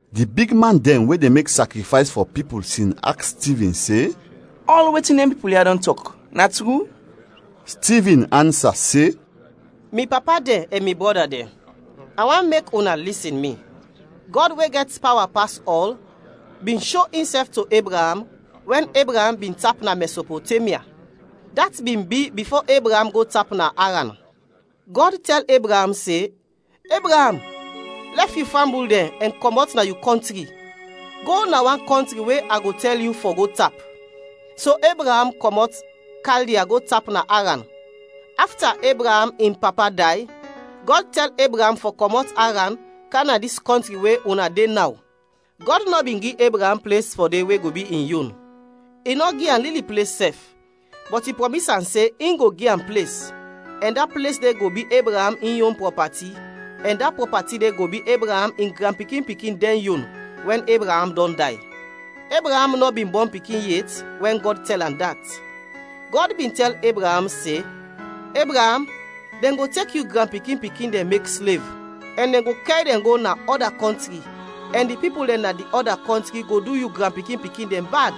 Di bigman dɛn we de mek sakrifays fɔ pipul sin aks Stivin se, “Ɔl wetin dɛn pipul ya dɔn tɔk, na tru?” Stivin ansa se, “Mi papa dɛn ɛn mi brɔda dɛn, a want mek una lisin mi! Gɔd we gɛt pawa pas ɔl bin sho insɛf to Ebraam wɛn Ebraam bin tap na Mɛsopotemya. Dat bin bi bifo Ebraam go tap na Aran. Gɔd tɛl Ebraam se, ‘Ebraam, lɛf yu fambul dɛn ɛn kɔmɔt na yu kɔntri, go na wan kɔntri we a go tɛl yu fɔ go tap.’ So Ebraam kɔmɔt Kaldia go tap na Aran. Afta Ebraam in papa day, Gɔd tɛl Ebraam fɔ kɔmɔt Aran, kam na dis kɔntri we una de naw. Gɔd nɔ bin gi Ebraam ples fɔ de we go bi in yon; i nɔ gi am lili ples sɛf, bɔt i prɔmis am se in go gi am ples, ɛn da ples de go bi Ebraam in yon prɔpati ɛn da prɔpati de go bi Ebraam in granpikin-pikin dɛn yon, wɛn Ebraam dɔn day. Ebraam nɔ bin bɔn pikin yet wɛn Gɔd tɛl am dat. Gɔd bin tɛl Ebraam se, ‘Ebraam, dɛn go tek yu granpikin-pikin dɛn mek slev, ɛn dɛn go kɛr dɛn go na ɔda kɔntri ɛn di pipul dɛn na di ɔda kɔntri go du yu granpikin-pikin dɛn bad.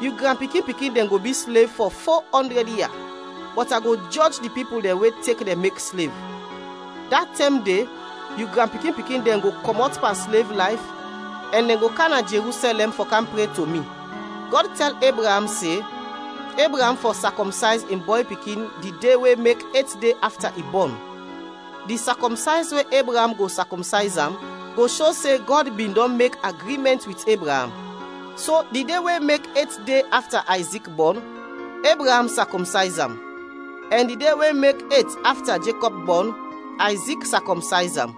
Yu granpikin-pikin dɛn go bi slev fɔ fo ɔndrɛd ia. Bɔt a go jɔj di pipul dɛn we tek dɛn mek slev. Da tɛm de yu granpikin-pikin dɛn go kɔmɔt pan slev layf ɛn dɛn go kam na Jerusɛlɛm fɔ kam pre to mi.’ Gɔd tɛl Ebraam se Ebraam fɔ sakɔmsayz in bɔy pikin di de we mek et de afta i bɔn. Di sakɔmsayz we Ebraam go sakɔmsayz am go sho se Gɔd bin dɔn mek agrimɛnt wit Ebraam. So di de we mek et afta Ayzik bɔn, Ebraam sakɔmsayz am; ɛn di de we mek et afta Jekɔb bɔn, Ayzik sakɔmsayz am;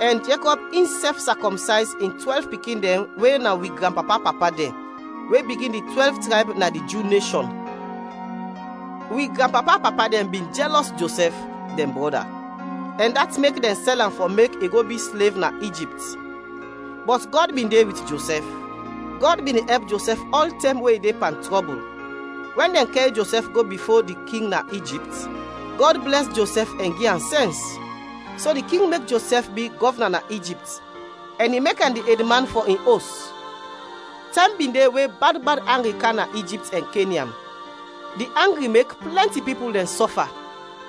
ɛn Jekɔb insɛf sakɔmsayz in twɛlv pikin dɛn we na wi granpapa-papa dɛn, we bigin di twɛlv trayb na di Ju neshɔn. “Wi granpapa-papa dɛn bin jɛlɔs Josɛf, dɛn brɔda, ɛn dat mek dɛn sɛl am fɔ mek i go bi slev na Ijipt; bɔt Gɔd bin de wit Josɛf. Gɔd bin de ɛp Josɛf ɔltɛm we i de pan trɔbul. Wɛn dɛn kɛr Josɛf go bifo di king na Ijipt, Gɔd blɛs Josɛf ɛn gi am sɛns; so di king mek Josɛf bi gɔvna na Ijipt ɛn i mek am di edman fɔ in os. Tɛm bin de we bad bad angri kam na Ijipt ɛn Kenyan. Di angri mek plɛnti pipul dɛn sɔfa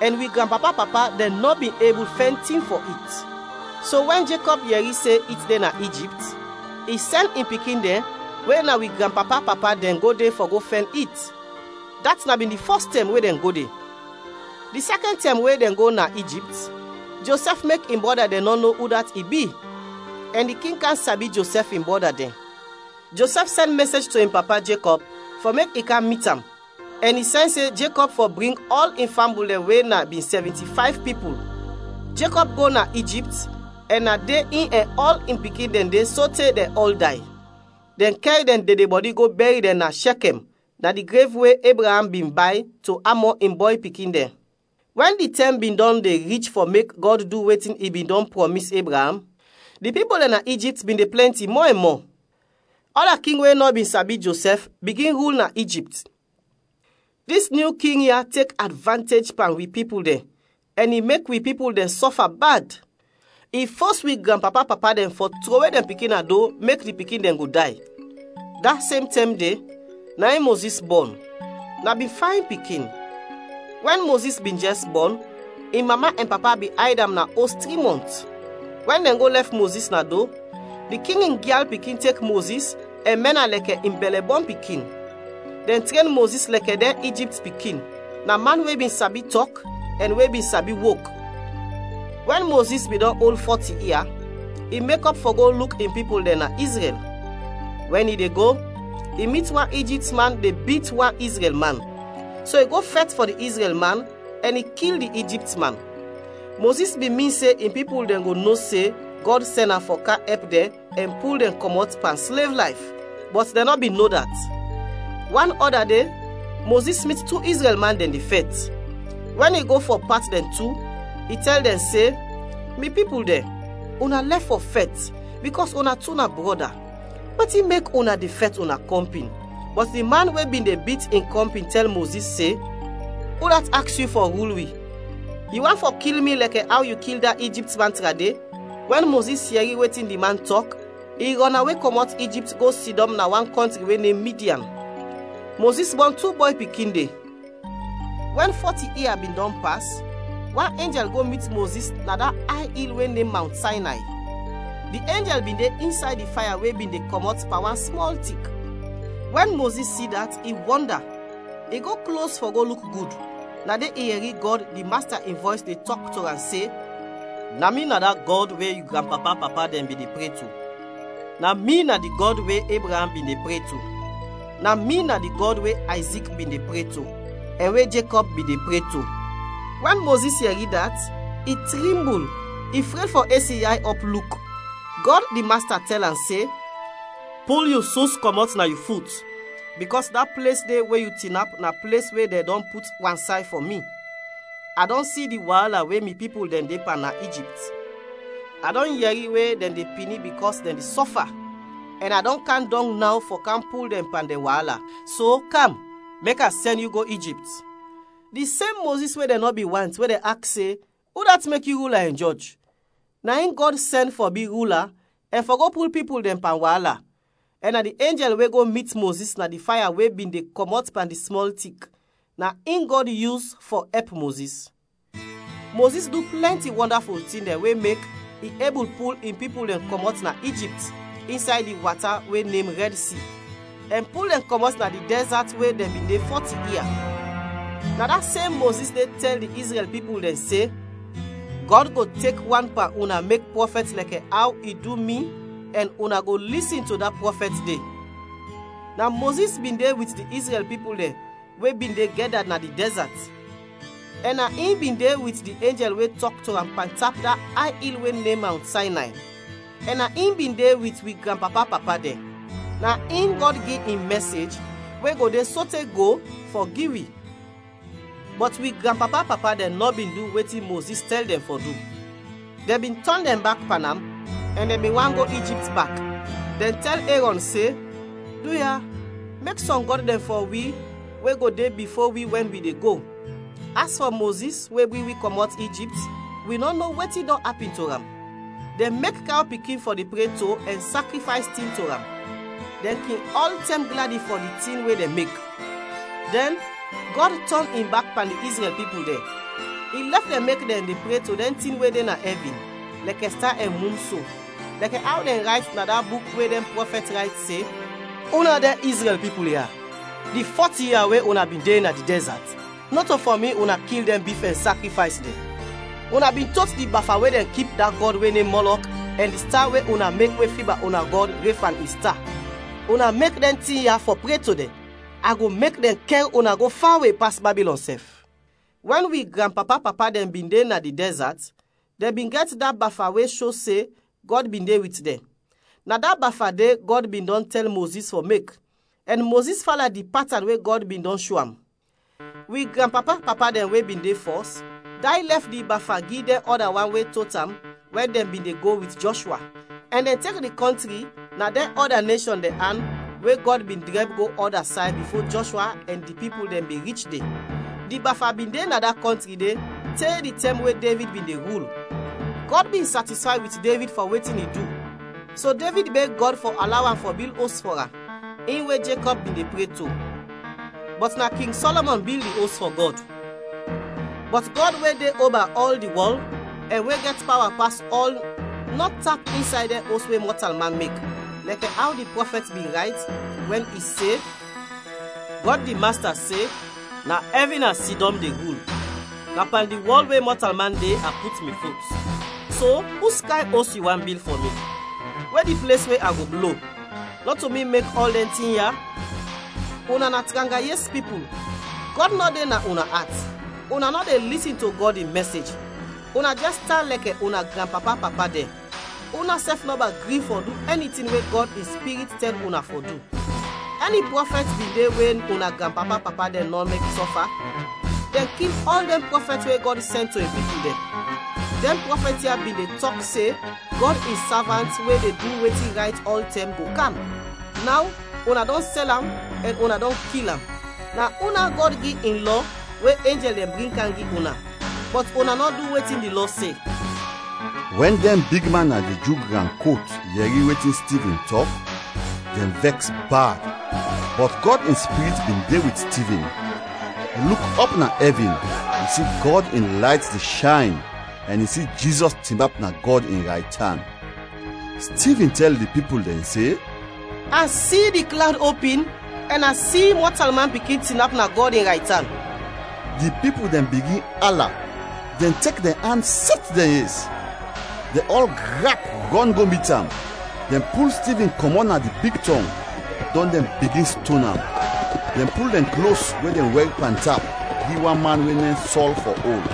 ɛn wi granpapa-papa dɛn nɔ bin ebul fɛn tin fɔ it. So wɛn Jekɔb yɛri se it de na Ijipt i sɛn in pikin dɛn we na wi granpapa-papa dɛn go de fɔ go fɛn it, dat na bin di fɔs tɛm we dɛn go de. Di sɛkɛn tɛm we dɛn go na Ijipt, Josɛf mek in brɔda dɛn no udat i bi, ɛn di king kam sabi Josɛf in brɔda dɛn. Josɛf sɛn mɛsej to in papa, Jekɔb, fɔ mek i kam mit am ɛn i sɛn se Jekɔb fɔ bring ɔl in fambul dɛn we na bin sɛvinti fayv pipul. Jekɔb go na Ijipt, ɛn na de in ɛn ɔl in pikin dɛn de sote dɛn ɔl day. Dɛn kɛr dɛn dedebɔdi go bɛr dɛn na Shɛkɛm na di grev we Ebraam bin bay to Amɔ in bɔy pikin dɛn. “Wɛn di tɛm bin dɔn de rich fɔ mek Gɔd du wetin i bin dɔn prɔmis Ebraam, di pipul dɛn na Ijipt bin de plɛnti mɔ ɛn mɔ. Ɔda king we nɔ bin sabi Josɛf, bigin rul na Ijipt. Dis nyu king ya tek advantej pan wi pipul dɛn ɛn i mek wi pipul dɛn sɔfa bad. I fos wi granpapa-papa dɛn fɔ trowe dɛn pikin na do, mek di pikin dɛn go day. Da sem tɛm de, na in Mozis bɔn; na bin fayn pikin. Wɛn Mozis bin jɛs bɔn, in mama ɛn papa bin ayd am na os tri mɔnt. Wɛn dɛn go lɛf Mozis na do, di king in gyal pikin tek Mozis ɛn mɛn am lɛkɛ in bɛlɛ-bɔn pikin. Dɛn tren Mozis lɛkɛ dɛn Ijipt pikin; na man we bin sabi tɔk ɛn we bin sabi wok. “Wɛn Mozis bin dɔn ol fɔti ia, i mekɔp fɔ go luk in pipul dɛn na Izrɛl. Wɛn i de go, i mit wan Ijipt man de bit wan Izrɛl man, so i go fɛt fɔ di Izrɛl man ɛn i kil di Ijipt man. Mozis bin min se in pipul dɛn go no se Gɔd sɛn am fɔ kam ɛp dɛn ɛn pul dɛn kɔmɔt pan slev layf, bɔt dɛn nɔ bin no dat. Wan ɔda de Mozis mit tu Izrɛl man dɛn de fɛt. Wɛn i go fɔ pat dɛn tu, i tɛl dɛn se, ‘Mi pipul dɛn, una lɛf fɔ fɛt bikɔs una tu na brɔda. Wetin mek una de fɛt una kɔmpin?’ Bɔt di man we bin de bit in kɔmpin tɛl Mozis se, ‘Udat aks yu fɔ rul wi? Yu want fɔ kil mi lɛkɛ aw yu kil da Ijipt man trade?’ Wɛn Mozis yɛri wetin di man tɔk, i rɔnawe kɔmɔt Ijipt go sidɔm na wan kɔntri we nem Midian. Mozis bɔn tu bɔy pikin de. “Wɛn fɔti ia bin dɔn pas, wan enjɛl go mit Mozis na da ay il we nem Mawnt Saynay. Di enjɛl bin de insay di faya we bin de kɔmɔt pan wan smɔl tik. Wɛn Mozis si dat, i wɔnda; i go klos fɔ go luk gud, na de i yɛri Gɔd, di Masta in vɔys de tɔk to am se, ‘Na mi na da Gɔd we yu granpapa-papa dɛn bin de pre to, na mi na di Gɔd we Ebraam bin de pre to, na mi na di Gɔd we Ayzik bin de pre to, ɛn we Jekɔb bin de pre to.’ Wɛn Mozis yɛri dat, i trimbul, i fred fɔ es in yay ɔp, luk. Gɔd, di Masta tɛl am se, ‘Pul yu sus kɔmɔt na yu fut, bikɔs da ples de we yu tinap na ples we dɛn dɔn put wansay fɔ mi. A dɔn si di waala we mi pipul dɛn de pan na Ijipt. A dɔn yɛri we dɛn de pini bikɔs dɛn de sɔfa ɛn a dɔn kam dɔng naw fɔ kam pul dɛn pan dɛn waala. So kam, mek a sɛn yu go Ijipt.’ “Di sem Mozis we dɛn nɔ bin want, we dɛn aks se, ‘Udat mek yu rula ɛn jɔj?’ Na in Gɔd sɛn fɔ bi rula ɛn fɔ go pul pipul dɛn pan waala, ɛn na di enjɛl we go mit Mozis na di faya we bin de kɔmɔt pan di smɔl tik, na in Gɔd yus fɔ ɛp Mozis. Mozis du plɛnti wɔndaful tin dɛn we mek i ebul pul in pipul dɛn kɔmɔt na Ijipt, insay di wata we nem Rɛd Si, ɛn pul dɛn kɔmɔt na di dɛzat we dɛn bin de fɔti ia. Na da sem Mozis de tɛl di Izrɛl pipul dɛn se, ‘Gɔd go tek wan pan una mek prɔfɛt lɛkɛ aw i du mi ɛn una go lisin to da prɔfɛt de.’ Na Mozis bin de wit di Izrɛl pipul dɛn we bin de gɛda na di dɛzat; ɛn na in bin de wit di enjɛl we tɔk to am pantap da ay il we nem Mawnt Saynay, ɛn na in bin de wit wi granpapa-papa dɛn. Na in Gɔd gi in mɛsej, we go de sote go, fɔ gi wi. “Bɔt wi granpapa-papa dɛn nɔ bin du wetin Mozis tɛl dɛn fɔ du, dɛn bin tɔn dɛn bak pan am ɛn dɛn bin want go Ijipt bak, dɛn tɛl Erɔn se, ‘Duya, mek sɔm gɔd dɛn fɔ wi we go de bifo wi wɛn wi de go; as fɔ Mozis we bring wi kɔmɔt Ijipt wi nɔ no wetin dɔn apin to am.’ Dɛn mek kaw pikin fɔ de pre to ɛn sakrifays tin to am; dɛn kin ɔltɛm gladi fɔ di tin we dɛn mek. Dɛn, Gɔd tɔn in bak pan di Izrɛl pipul dɛn; i lɛf dɛn mek dɛn de pre to dɛn tin we de na ɛvin, lɛkɛ sta ɛn mun so, lɛkɛ aw dɛn rayt na da buk we dɛn prɔfɛt rayt, se ‘Una, dɛn Izrɛl pipul ya, di fɔti ia we una bin de na di dɛzat nɔto fɔ mi una kil dɛn bif ɛn sakrifays dɛn. Una bin tot di bafa we dɛn kip da gɔd we nem Mɔlɔk ɛn di sta we una mek we fiba una gɔd, Refan in sta; una mek dɛn tin ya fɔ pre to dɛn; a go mek dɛn kɛr una go fawe pas Babilɔn sɛf.’ “Wɛn wi granpapa-papa dɛn bin de na di dɛzat dɛn bin gɛt da bafa we sho se Gɔd bin de wit dɛn. Na da bafa de Gɔd bin dɔn tɛl Mozis fɔ mek, ɛn Mozis fala di patan we Gɔd bin dɔn sho am. Wi granpapa-papa dɛn we bin de fɔs, day lɛf di bafa gi dɛn ɔda wan we tot am wɛn dɛn bin de go wit Jɔshwa, ɛn dɛn tek di kɔntri na dɛn ɔda neshɔn dɛn an we Gɔd bin drɛb go ɔda say bifo Jɔshwa ɛn di pipul dɛn bin rich de. Di bafa bin de na da kɔntri de, te di tɛm we Devid bin de rul. Gɔd bin satisfay wit Devid fɔ wetin i du, so Devid beg Gɔd fɔ alaw am fɔ bil os fɔ am; in we Jekɔb bin de pre to. Bɔt na King Sɔlɔmɔn bil di os fɔ Gɔd. “Bɔt Gɔd we de oba ɔl di wɔl, ɛn we gɛt pawa pas ɔl nɔ tap insay dɛn os we mɔtalman mek; lɛkɛ aw di prɔfɛt bin rayt, wɛn i se, ‘Gɔd di Masta se, “Na ɛvin a sidɔm de rul, na pan di wɔl we mɔtalman de, a put mi fut. So uskayn os yu want bil fɔ mi? We di ples we a go blo? Nɔto mi mek ɔl dɛn tin ya?” ’ “Una na tranga yes pipul! Gɔd nɔ de na una at, una nɔ de lisin to Gɔd in mɛsej! Una jɛs tan lɛkɛ una granpapa-papa dɛn: unasɛf nɔba gri fɔ du ɛni tin we Gɔd in Spirit tɛl una fɔ du. Ɛni prɔfɛt bin de we una granpapa-papa dɛn nɔ mek sɔfa? Dɛn kil ɔl dɛn prɔfɛt we Gɔd sɛn to in pipul dɛn. Dɛn prɔfɛt ya bin de tɔk se Gɔd in Savant we de du wetin rayt ɔltɛm, go kam. Naw, una dɔn sɛl am ɛn una dɔn kil am. Na una Gɔd gi in Lɔ we enjɛl dɛn bring kam gi una bɔt una nɔ du wetin di Lɔ se!” Wɛn dɛn bigman na di Ju gran kot yɛri wetin Stivin tɔk, dɛn vɛks bad. Bɔt Gɔd in Spirit bin de wit Stivin, i luk ɔp na ɛvin, i si Gɔd in layt de shayn ɛn i si Jizɔs tinap na Gɔd in raytan. Stivin tɛl di pipul dɛn se, “A si di klawd opin ɛn a si Mɔtalman Pikin tinap na Gɔd in raytan!” Di pipul dɛn bigin ala; dɛn tek dɛn an sɛt dɛn yes. Dɛn ɔl grap rɔn go mit am. Dɛn pul Stivin kɔmɔt na di big tɔng, dɔn dɛn bigin ston am. Dɛn pul dɛn klos we dɛn wɛr pantap gi wan man we nem Sɔl fɔ ol.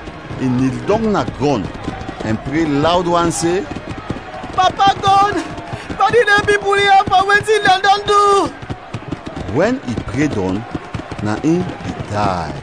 I nil dɔng na grɔn ɛn pre lawd wan se, “Papa Gɔd, padin dɛn pipul ya fɔ wetin dɛn dɔn du!” Wɛn i pre dɔn, na in i day.